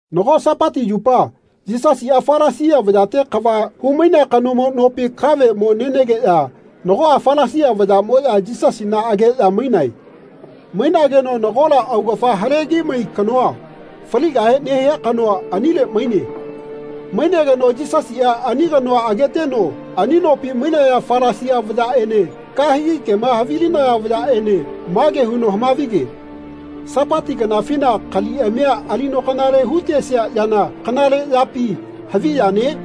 Nago Sapati yupa Yisasiꞌa Falasia vayate kava humainea kanomo nopi kave mo nenegeꞌya nagoꞌa Falasia vayaꞌmoꞌya Yisasina ageꞌya mainae. Mainageno nagola augafa halegimai kanoa, faligahe nehia kanoa, anile maine. Mainegeno Yisasiꞌa ani kanoa ageteno ani nopi mainaya Falasia vayaꞌene kahegi kema havilinaya vayaꞌene mage huno hamavige “Sapati kanafina kaliꞌamia alino kanale hutesia yana kanale yapi havi yane?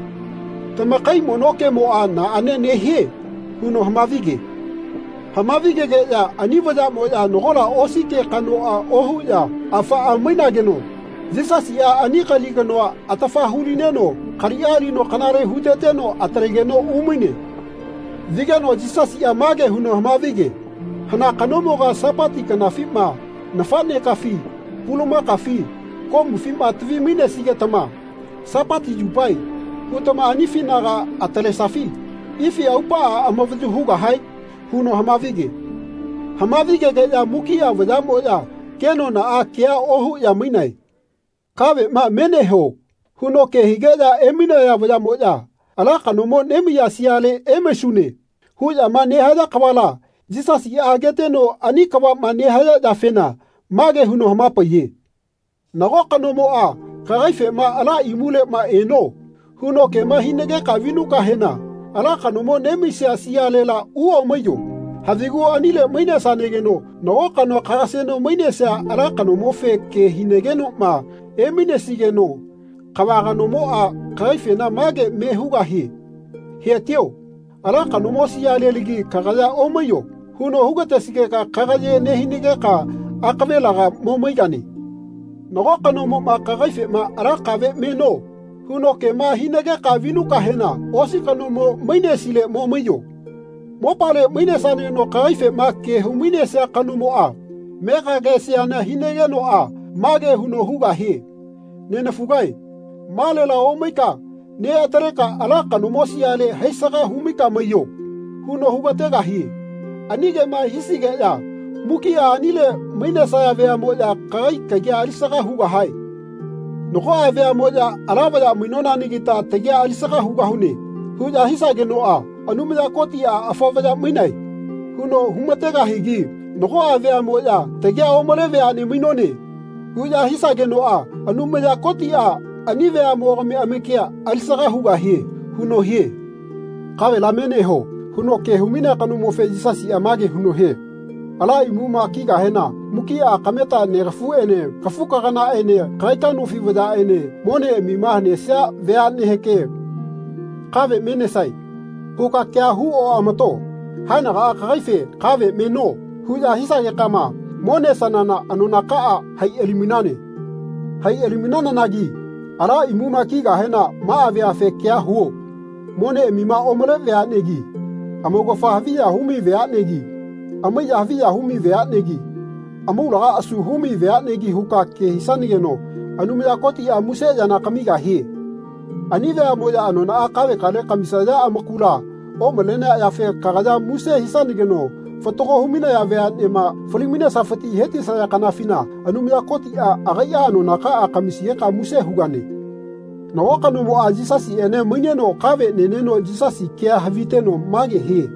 Tamakai mono kemoꞌa naꞌane nehie?” huno hamavige. Hamavigegeꞌya ani vayaꞌmoꞌya nagola osi ke kanoꞌa ohuꞌya afaꞌa mainageno Yisasiꞌa ani kali kanoa atafa hulineno kaliꞌa alino kanale huteteno atalegeno umaine. Vigeno Yisasiꞌa mage huno hamavige “Hana kanomoga Sapati kanafima nafaꞌnekafi pulumakafi komufima tavi-mainesigetama ‘Sapati yupae.’ hutama anifinaga atalesafi ifi aupaꞌa amavayu hugahae?” huno hamavige. Hamavigegeꞌya mukiꞌa vayaꞌmoya kenonaꞌa kea ohuꞌya mainae. “Kaveꞌma me neho.” huno ke higeꞌya emainaya vayaꞌmoꞌya “Ala kanomo nemaiya siale emaisune.” huꞌyama nehaya kavala Yisasiꞌa ageteno ani kavaꞌma nehaya yafena mage huno hamapaiye. “Nago kanomoꞌa kagaifema ‘Ala imuleꞌma eno.’ huno kema hinageka vinukahena ala kanomo nemaiya sialela uomaiyo. Havigu anile mainesanageno nago kanoa kagaseno mainesia ala kanomofe ke hinagenoꞌma emainesigeno kava kanomoꞌa kagaifena mage me hugahie ‘He-tio. Ala kanomo sialelagi kagaya omaiyo.’ huno hugatesigeka kagaye nehinageka akavelaga mo maigane. Nago kanomoꞌma kagaifema ‘Ala kave meno.’ huno kema hinageka vinukahena osi kanomo mainesile mo maiyo. Mopale mainesanageno kagaifema ke humainesia kanomoꞌa megagesiana hinagenoꞌa mage huno hugahie ‘Nenafugae malela omaika neꞌataleka ala kanomo siale haisaga humaika maiyo.’ huno hugategahie. Ani kema hisigeꞌya mukiꞌa anile mainesaya veaꞌmoꞌya kagai kagi alisaga hugahae. Nagoꞌa veaꞌmoꞌya ‘Ala vaya mainonanagita tagia alisaga hugahune.’ huꞌya hisagenoꞌa Anumaya Kotiꞌa ‘Afa vaya mainae.’ huno humategahigi nagoꞌa veaꞌmoꞌya ‘Tagia omale veaꞌne mainone.’ huꞌya hisagenoꞌa Anumaya Kotiꞌa ani veaꞌmogami amakia alisaga hugahie.” huno hie. “Kavela me neho.” huno ke humainea kanomofe Yisasiꞌa mage huno hie “Ala imuma kigahena mukiꞌa kameta negafuꞌene kafukaganaꞌene kagaika nofi vayaꞌene moneꞌamima hanesia veaꞌneheke ‘Kave me nesae.’ huka kea hu oꞌamato. Haenagaꞌa kagaife ‘Kave meno.’ huꞌya hisagekama mo nesanana anonakaꞌa hai ali-mainane. Hai ali-mainanagi ala imuma kigahena maꞌa veafe kea huo moneꞌamima omale veaꞌnegi amaugafa haviya humai veaꞌnegi amaiya haviya humai veaꞌnegi amaulaga asu humai veaꞌnegi huka ke hisanageno Anumaya Kotiꞌa muse yana kamigahie. Ani veaꞌmoꞌya anonaꞌa kavekale kamisaya amakula omalenea yafe kagaya muse hisanageno fatago humainaya veaꞌnema fali-mainesafiti hetisaya kanafina Anumaya Kotiꞌa agaiꞌa anonakaꞌa kamisigeka muse hugane.” Nago kanomoꞌa Yisasiꞌene maineno kave neneno Yisasi kea haviteno mage hie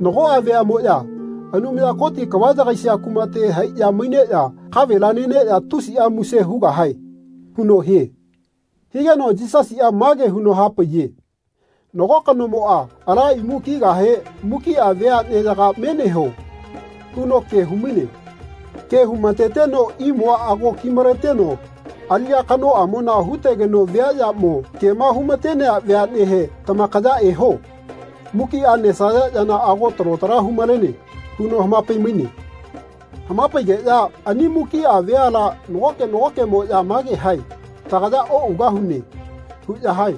“Nagoꞌa veaꞌmoꞌya Anumaya Koti kava yagaisia kumate haiꞌya maineꞌya kavela neneꞌya tusiꞌa muse hugahae.” huno hie. Higeno Yisasiꞌa mage huno hapaiye “Nago kanomoꞌa ala imu kigahe mukiꞌa veaꞌneyaga ‘Meneho.’ huno ke humaine. Ke humateteno imua ago kimaleteno aliꞌya kanoꞌamona hutegeno viaꞌyamo kema humatenea veaꞌnehe ‘Tamakaya eho. Mukiꞌa nesaya yana ago talo tala humalene.’ huno hamapai-maine. Hamapaigeꞌya ani mukiꞌa veala nagoke nagokeꞌmoꞌya mage hae ‘Tagaya oꞌugahune.’ huꞌya hae.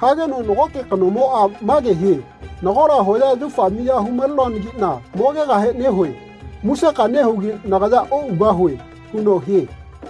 Hageno nagoke kanomoꞌa mage hie ‘Nagola hoya yaufa miya humalenoanagiꞌna mogegahe nehue. Museka nehugi nagaya oꞌugahue.’ huno hie.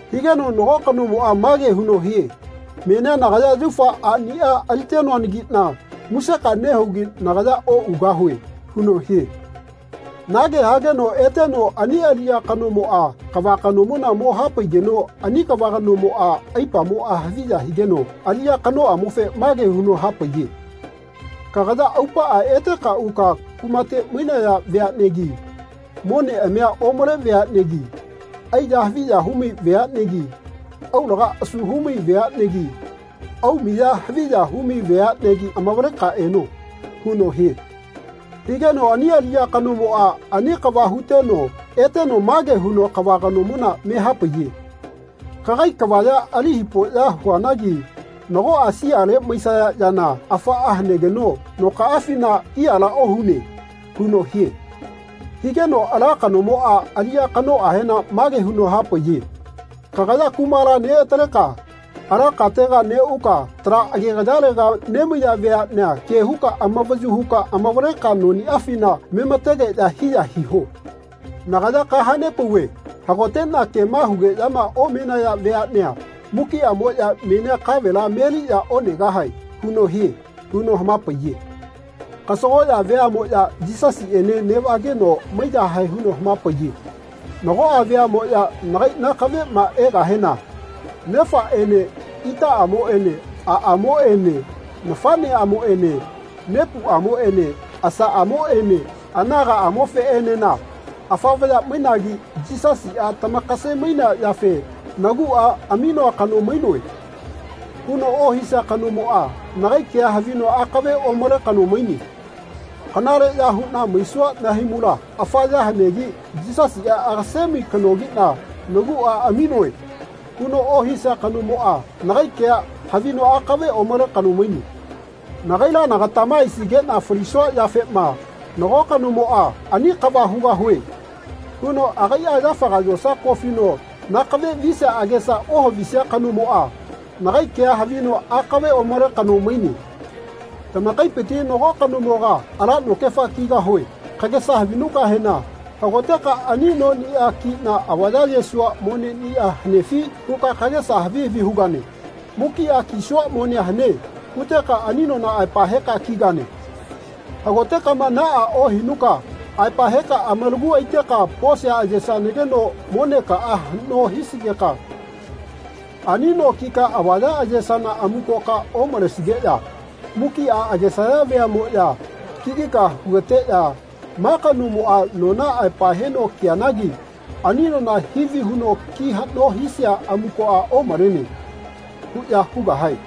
Higeno nago kanomoꞌa mage huno hie ‘Menia nagaya yaufa aꞌniꞌa alitenoanagiꞌna museka nehugi nagaya oꞌugahue.’ huno hie. Nage hageno eteno ani aliꞌya kanomoꞌa kava kanomona mo hapaigeno ani kava kanomona aipamoꞌa haviya higeno aliꞌya kanoꞌamofe mage huno hapaiye ‘Kagaya aupaꞌa eteka uka kumate mainaya veaꞌnegi moneꞌamiꞌa omale veaꞌnegi aiya haviya humai veaꞌnegi aulaga asu humai veaꞌnegi aumiꞌya haviya humai veaꞌnegi amavaleka eno.’ huno hie. Higeno ani aliꞌya kanomoꞌa ani kava huteno eteno mage huno kava kanomona me hapaiye ‘Kagai kavaya ali hipoꞌya huanagi nagoꞌa siale maisaya yana afaꞌa hanegeno nokaꞌafina hiyala ohune.’ huno hie. Higeno ala kanomoꞌa aliꞌya kanoꞌahena mage huno hapaiye ‘Kagaya kumala neꞌataleka ala katega neꞌuka tala agegayalega nemaiya veaꞌnea ke huka amavayu huka amavaleka noniꞌafina memategeꞌya hiya hiho. Nagaya kahanepauve hagoteꞌna kema nehugeꞌyama omenaya veaꞌnea mukiꞌamoꞌya menia kavela meliꞌya onegahae.’ huno hie.” huno hamapaiye. Kasagoꞌya veaꞌmoꞌya Yisasiꞌene neꞌvageno maiyahae huno hamapaiye “Nagoꞌa veaꞌmoꞌya nagai nakaveꞌma egahena nefaꞌene itaꞌamoꞌene aꞌamoꞌene nafaꞌneꞌamoꞌene nepuꞌamoꞌene asaꞌamoꞌene aganaꞌamofeꞌenena ‘Afa vaya mainagi Yisasiꞌa tamakase-mainea yafe naguꞌa aminoa kano mainoe.’ huno ohisia kanomoꞌa nagai kea havino akave omale kano maine. ‘Kanaleꞌya huꞌna maisua nahaimula afa ya hanegi Yisasiꞌa agasemai kanogiꞌna naguꞌa aminoe.’ huno ohisia kanomoꞌa nagai kea havino aꞌkave omale kano maine. Nagaila nagatama aisigeꞌna falisua yafema nago kanomoꞌa ‘Ani kava hugahue.’ huno agaiꞌa yafaga yosa kofino nakave visia agesa ohavisia kanomoꞌa nagai kea havino aꞌkave omale kano maine. Tamakaipiti nago kanomoga ‘Ala nokefa kigahue.’ kagesa havinukahena hagoteka ‘Ani noniꞌa kiꞌna avaya ayesua moneꞌnia hanefi?’ huka kagesa havi havi hugane. ‘Mukiꞌa kisua monea hane.’ huteka ani nona aepa heka kigane. Hagotekama naꞌa ohinuka aepa heka amalagu aiteka posia ayesanageno monekaꞌa haꞌno hisigeka ani no kika avaya ayesana amukoka omalesigeꞌya mukiꞌa agesaya veaꞌmoꞌya kigika hugateꞌya ‘Ma kanomoꞌa nona aepa heno kianagi ani nona hivi huno ki haꞌno hisia amukoꞌa omalene.’ huꞌya hugahae.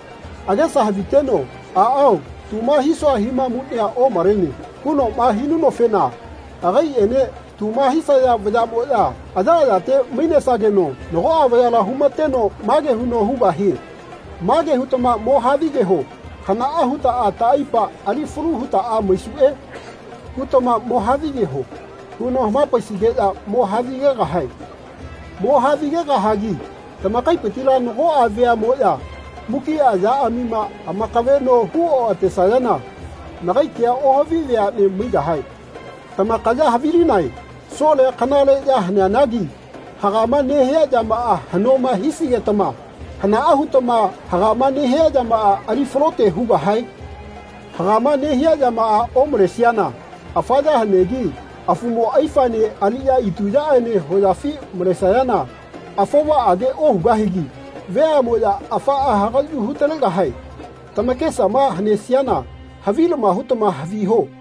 Agesa haviteno ‘Aꞌao tuma hisua himamuꞌnia omalene.’ hunoꞌma hinunofena agaiꞌene tuma hisaya vayaꞌmoꞌya ayaꞌayate mainesageno nagoꞌa vayala humateno mage huno hugahie ‘Mage hutama mo havigeho ‘Hanaꞌa hutaꞌa taꞌaipa ali falu hutaꞌa maisuꞌe.’ hutama mo havigeho.’ huno hamapaisigeꞌya mo havigegahae. Mo havigegahagi tamakaipitila nagoꞌa veaꞌmoꞌya mukiꞌa yaꞌamima amakaveꞌno hu oꞌatesayana nagai kea ohavi veaꞌne maigahae.” Tamakaya havilinae solea kanale ya haneanagi hagama nehia yamaꞌa haꞌnoma hisigetama hanaꞌa hutama hagama nehia yamaꞌa ali falote hugahae? Hagama nehia yamaꞌa omalesiana afa ya hanegi afumo aifaene aliꞌya ituyaꞌene hoyafi malesayana afovaꞌage ohugahigi veaꞌmoꞌya afaꞌa hagaꞌyu hutalegahae. Tamakesama hanesiana havilama hutama haviho.